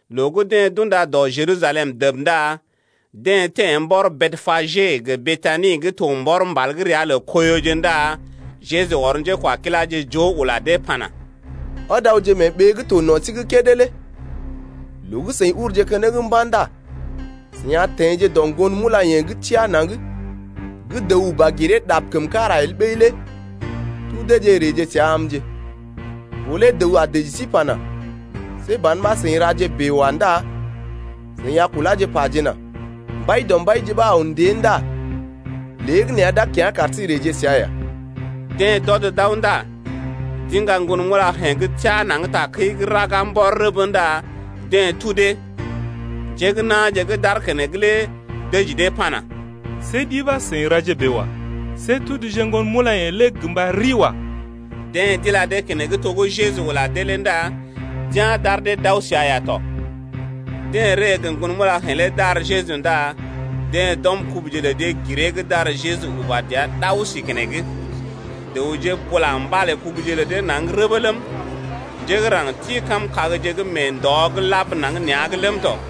Loo gə́ deḛ d’unda dɔ Jerusalem dəb ndá deḛ teḛ mbɔr Betpage gə Betani gə́ to mbɔr mbal gə́ ria lə Koiyoje ndá Jeju ɔr njékwakiláje joo ula dee pana: Ɔd awje mee ɓee gə́ to no̰ sí’g kédé lé. Loo gə́ seḭ uruje keneŋ mba̰ ndá seḭ a teḛje dɔ ŋgon mulayḛ̀je gə́ teá naŋg gə́ dəw uba giree ɗab kəm kára el ɓəi lé, tudeeje reeje səa amje. Ɓó lé dəw a dəji sí pana: See ban ɓa seḭ raje bèe wa ndá seḭ a kuláje pajena: Mbaidɔmbaije ɓa aw ndée ndá léegəneeya d’a kya̰ kar sí reeje səa ya. Deḛ d’ɔd d’aw ndá d’iŋga ŋgon mulayḛ̀je gə́ teá naŋg takəi’g raga mbɔr rəbə ndá deḛ tudee. Njé gə́ na̰je gə́ d’aar keneŋ lé dəji dee pana: See ɗi ɓa seḭ raje bèe wa. See tuduje ŋgon mulayḛ̀je lé gə mba riwa. Deḛ d’ila dee keneŋ to gə́ Jeju ula dee lé ndá d’ya̰ d’ar dee d’aw səa ya tɔ. Deḛ ree gə ŋgon mulayḛ̀je lé d’ar Jeju ndá deḛ d’ɔm kubuje lə dee giree’g d’ar Jeju uba dəa ɗao si keneŋ. Dəwje bula mbalé kubuje lə dee naŋg rəbə ləm, njé gə́ raŋg ti kam kagje gə́ mee ndɔ’g lab naŋg nea̰’g ləm tɔ.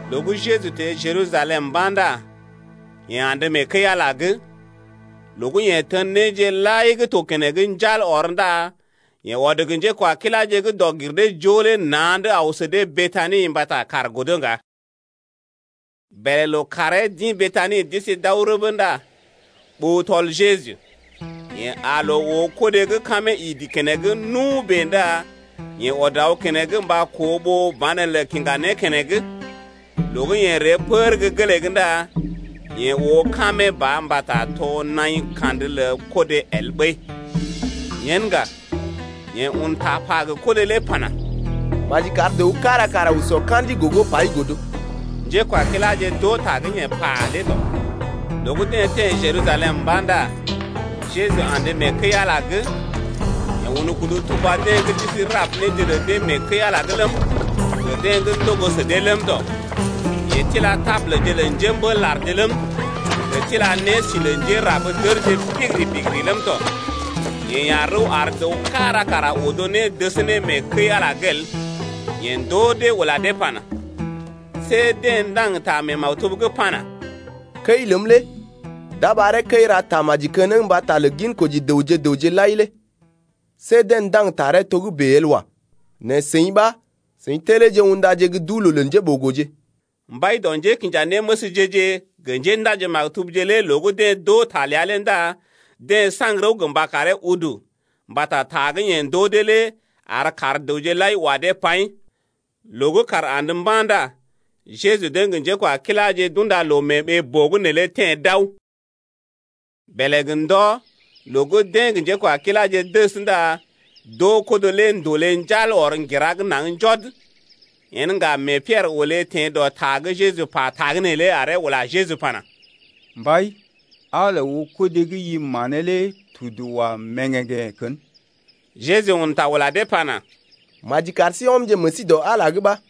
Loo gə́ Jeju teḛ Jerusalem mba̰ ndá yeḛ andə mee kəi-Ala’g. Loo gə́ Yeḛ tən néje lai gə́ to keneŋ njal ɔr ndá yeḛ ɔd gə njékwakiláje gə́ dɔg-gir-dee-joo lé na̰’d aw sə dee Betani mbata kàr godo ŋga. Bèlè lookàree d’ḭ Betani d’isi d’aw rəbee ndá ɓó tɔl Jeju. Yeḛ aa loo oo kodé gə́ kamee idi keneŋ nu bèe ndá yeḛ ɔd aw keneŋ mba koo ɓó banelə kiŋga né keneŋ, loo gə́ yeḛ ree pər gə́ gelee’g ndá yeḛ oo kamee ba mbata to naḭ kandə lə kodé el ɓəi. Yen ŋga, yeḛ un ta pa gə kodé lé pana: Maji kar dəw kára kara sɔ ka̰di gogo pai godo. Njékwakiláje d’oo ta gə́ yeḛ pa lé tɔ. Loo gə́ deḛ teḛ Jerusalem mba̰ ndá Jeju andə mee kəi-Ala’g. Yeḛ un kudu tuba deḛ gə́ d’isi rab néje lə dee mee kəi-Ala’g ləm, gə deḛ gə́ ndogo sə dee ləm tɔ. Yeḛ tila tabulje lə njémbél-larje ləm, gə tila nési lə njérab-dərje bigiri-bigiri ləm tɔ. Yeḛ ya̰ rəw ar dəw kára kara odo né dəs ne mee kəi-Ala’g el. Yeḛ ndoo dee ula dee pana: See deḛ ndaŋg ta mee maktub’g pana: Kəi ləm lé d’a ɓaree kəi ra tamaji keneŋ mbata lə ginkoji dəwje gə raŋg lai lé, see deḛ ndaŋg taree togə́bè el wa. Nɛ seḭ ɓa seḭ telee undaje gə́ duu-loo lə njéɓogoje. Mbai dɔ njékinjanéməsje-je gə njéndaji-maktubje lé loo gə́ deḛ d’oo ta ləa lé ndá deḛ saŋg rəw gə mba karee udu, mbata ta gə́ yeḛ ndoo dee lé ar kaar dəwje lai wa dee paḭ. Loo gə́ kàr andə mba̰ ndá Jeju deḛ gə njékwakiláje d’unda loo mee ɓee-boo’g neelé teḛ d’aw. Bèlè gə ndɔ, loo gə́ deḛ gə njékwakiláje dəs ndá d’oo kodé lé ndòlé njal ɔr ŋgira’g naŋg njɔd. Yen ŋga mee Piɛrə olé teḛ dɔ ta gə́ Jeju pa tagə́nè lé aree ula Jeju pana: Mbai, aa loo oo kodé gə́ i manee lé tudu wa mèŋgèŋgḛ̀ kən. Jeju un ta ula dee pana: Maji kar sí ɔmje meḛ sí dɔ Ala’g ɓa.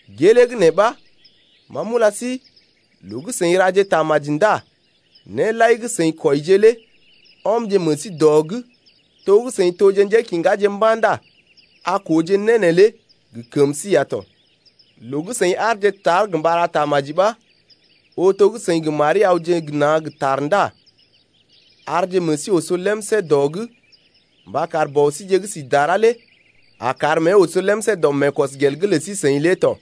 Gelee gə́ nee ɓa ma m’ula sí, loo gə́ seḭ raje tamaji ndá né lai gə́ seḭ kwɔije lé ɔmje meḛ sí dɔ’g to gə́ seḭ toje njékiŋgaje mba̰ ndá a kooje née lé gə kəm sí ya tɔ. Loo gə́ seḭ aarje tar gə mba ra tamaji ɓa ooje to gə́ seḭ gə́ mari awje gə na̰ gə ta ndá arje meḛ sí oso lemsé dɔ’g mba kar Bɔ síje gə́ si dara lé a kar mée oso lemsé dɔ meekɔsgel’g lə sí-seḭ lé tɔ.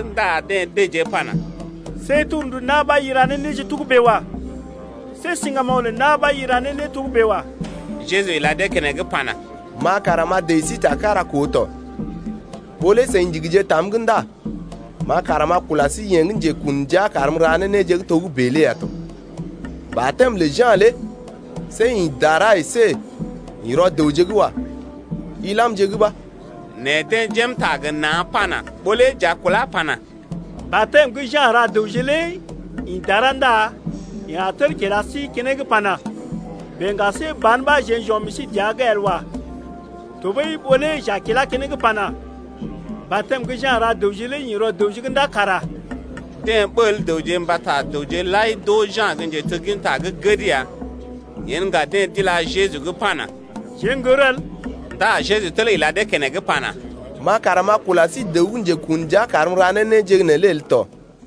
ndá deḛ dəjee pana: See torndu na̰ ɓa i ra ne néje togə́bè wa. See siŋgamoŋ lə na̰ ɓa i ra ne né togə́bè wa. Jeju ila dee keneŋ pana: Ma kara m’a dəji sí ta kára koo tɔ. Ɓó lé seḭ ndigije tam’g ndá ma kara m’a kula sí yeḛ gə́ njekun ndia karm m’ra ne néje togə́bè lé ya tɔ. Batɛm lə Ja̰ lé see ḭ dara əsé ḭ rɔ dəwje’g wa. Ilamje’g ɓa. Nɛ deḛ jém ta gə na̰ pana: Ɓó lé j’a kulá pana: Batɛm gə́ Ja̰ ra dəwje lé ḭ dara ndá yeḛ a tel kila sí keneŋ pana: Bèe ŋga see ban ɓa jeḛ j’ɔm meḛ sí dəa’g el wa. Tɔɓəi ɓó lé j’a kilá keneŋ pana: Batɛm gə́ Ja̰ ra dəwje lé ḭ rɔ dəwje’g ndá kara... Deḛ ɓəl dəwje mbata dəwje lai d’oo Ja̰ gə́ njetegginta gə́ gəd ya ləm. Yen ŋga deḛ d’ila Jeju’g pana: Jeḛ n’gər el. Ndá Jeju tel ila dee keneŋ pana: Ma kara m’a kula sí dəw gə́ njekun ndia karm m’ra ne néje neelé el tɔ.